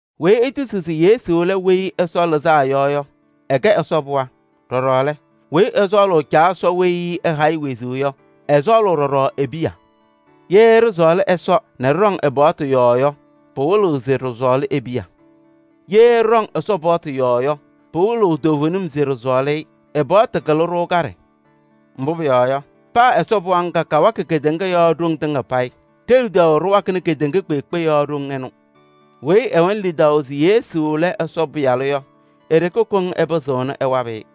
Weyi etisiɣ se Yesu lɛ Weyi Ɛsɔ Lɩzaa Yɔ yɔ, ɛkɛ Ɛsɔ pɩɣa. Ɖɔɖɔ lɛ, weyi ɛsɔɔlʋʋ Caa Ɛsɔ weyi ɛha-ɩ wezuu yɔ, ɛsɔɔlʋʋ ɖɔɖɔ e-piya. Ye ɖɩsɔɔlɩ Ɛsɔ nɛ ɖɩɖɔŋ ɛ-paɣtʋ yɔɔ yɔ, pɩwɩlɩɣ se ɖɩsɔɔlɩ e-piya. Ye ɖɩɖɔŋ Ɛsɔ paɣtʋ yɔɔ yɔ, pɩwɩlɩɣ toovenim se ɖɩsɔɔlɩ-ɩ. Ɛ-paɣtʋ takɩlɩ-ɖʋ kaɖɛ, mbʋ pʋyɔɔ yɔ, paa Ɛsɔ pɩɣa ŋga kawakɩ kedeŋa yɔɔ ɖoŋ tɩŋa payɩ. Ɖe-lidaʋ ɖɩwakɩnɩ kedeŋa kpeekpe yɔɔ ɖoŋ ɩnʋ. Weyi ɛwɛnɩ lidaʋ se Yesu lɛ Ɛsɔ Pɩyalʋ yɔ, e-ɖeke koŋ ɛpɩzɩɣnɩ ɛwabɩ-ɩ.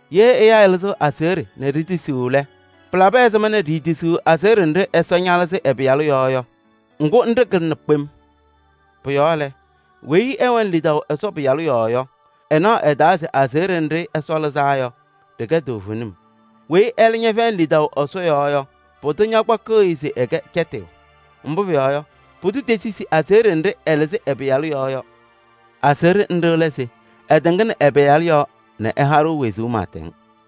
Ye ɛyaa ɛlɩzɩɣ aseɣɖe nɛ ɖitisiɣ lɛ, pɩlabɩ ɛzɩma ɖiitisiɣ aseɣɖe nɖɩ Ɛsɔ ñalɩzɩ ɛ-Pɩyalʋ yɔɔ yɔ? Ŋgʋ nɖɩ kɩlɩna kpem. Pʋ-yɔɔ lɛ, weyi ɛwɛnɩ lidaʋ Ɛsɔ Pɩyalʋ yɔɔ yɔ, ɛnaɣ ɛ-taa se aseɣɖe nɖɩ Ɛsɔ lɩzaa yɔ, ɖɩkɛ toovenim. Weyi ɛlɛ ñɛfɛyɩnɩ lidaʋ Ɛsɔ yɔɔ yɔ, pʋdʋ kpakɩɣ-ɩ se ɛkɛ cɛtɩyʋ. Mbʋ pʋyɔɔ yɔ, pʋdʋ tetisi aseɣɖe nɖɩ ɛlɩzɩ ɛ-Pɩyalʋ yɔɔ yɔ. Aseɣɖe nɖɩ lɛ se: ɛtɩŋnɩ ɛ-Pɩyalʋ yɔɔ nɛ ɛha-ɖʋ wezuu pɩɩtɛŋ.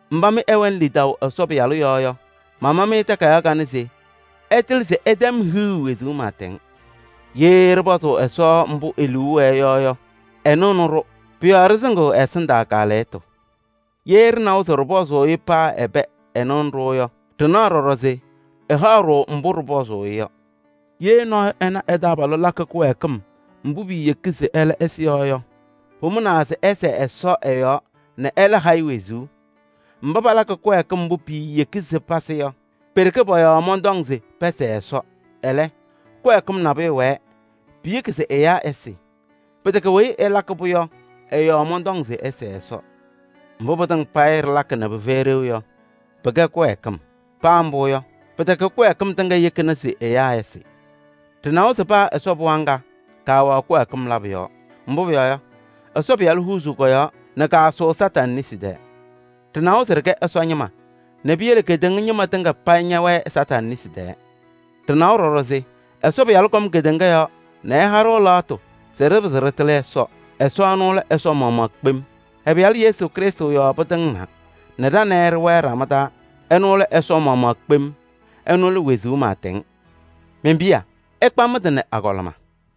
Mba mɩ ɩwɛnɩ lidaʋ Ɛsɔ Pɩyalʋ yɔɔ yɔ, mama-mɩ takayaɣ kanɛ se ɩtɩlɩ se ɩtɛm hiɣu wezuu pɩɩtɛŋ. Ye ɖɩpɔzʋʋ Ɛsɔ mbʋ e-liu wɛɛ yɔ yɔ, ɛnɩɣnɩ-ɖʋ. Pʋ-yɔɔ ɖɩsɩŋɩɣ ɛ-ɛsɩndaa kaalɛyɩtʋ. Ye ɖɩnawa se ɖɩpɔzɩ-ɩ paa ɛbɛ ɛnɩɣnɩ-ɖʋ yɔ, ɖɩnaɣ ɖɔɖɔ se ɛhaɣ-ɖʋ mbʋ ɖɩpɔzʋʋ-ɩ yɔ. Ye nɔɔyʋ ɛna ɛ-taabalʋ lakɩ kɩwɛɛkɩm mbʋ piiyeki se ɛlɛ ɛsɩ yɔ yɔ, pʋmʋnaa se ɛsɛɛ Ɛsɔ ɛ-yɔɔ nɛ ɛlɛ ha-ɩ wezuu. Mba palakɩ kɩwɛɛkɩm mbʋ piiyeki se pasɩ yɔ, pe-ɖeke pɔ-yɔɔ mɔntɔŋ se pɛsɛɛ Ɛsɔ. Ɛlɛ, kɩwɛɛkɩm nabʋyʋ wɛɛ, piyeki se ɛyaa ɛsɩ. Pɩtɛkɛ weyi ɛlakɩ-pʋ yɔ ɛ-yɔɔ mɔntɔŋ se ɩsɛɛ Ɛsɔ. Mbʋ pɩtɩŋa payɩ ɖɩlakɩ nɛ pɩfɛyɩ ɖeu yɔ, pɩkɛ kɩwɛɛkɩm. Paa mbʋ yɔ, pɩtɛkɛ kɩwɛɛkɩm tɩŋa yekini se ɛyaa ɛsɩ. Ɖɩnawa se paa Ɛsɔ pɩɣa ŋga, kaawɛɣ kɩwɛɛkɩm labʋ yɔɔ. Mbʋ pʋyɔɔ yɔ, Ɛsɔ Pɩyalʋ huuzuu kɔ-yɔɔ nɛ kaasʋʋ Kañadʋ Satanɩ nesi taa. Ɖɩnawa se ɖɩkɛ Ɛsɔ ñɩma nɛ piyele kedeŋa ñɩma tɩŋa payɩ ñɛwɛɛ Kañadʋ Satanɩ nesi taa. Ɖɩnawa ɖɔɖɔ se Ɛsɔ Pɩyalʋ kɔm kedeŋa yɔɔ nɛ ɛha-ɖʋ lɛɣtʋ se ɖɩpɩzɩ ɖɩtɩlɩ Ɛsɔ. Ɛsɔ ɛnʋ lɛ Ɛsɔ maɣmaɣ kpem. Ɛ-Pɩyalʋ Yesu Krɩstʋ yɔɔ pɩtɩŋnaa nɛ ɖa nɛ ɩ ɖɩwɛɛ ɖama taa. Ɛnʋ lɛ Ɛsɔ maɣmaɣ kpem, ɛnʋ lɛ wezuu pɩɩtɛŋ. Men-piya! Ɩkpa mɩ-tɩ nɛ agɔlɩma!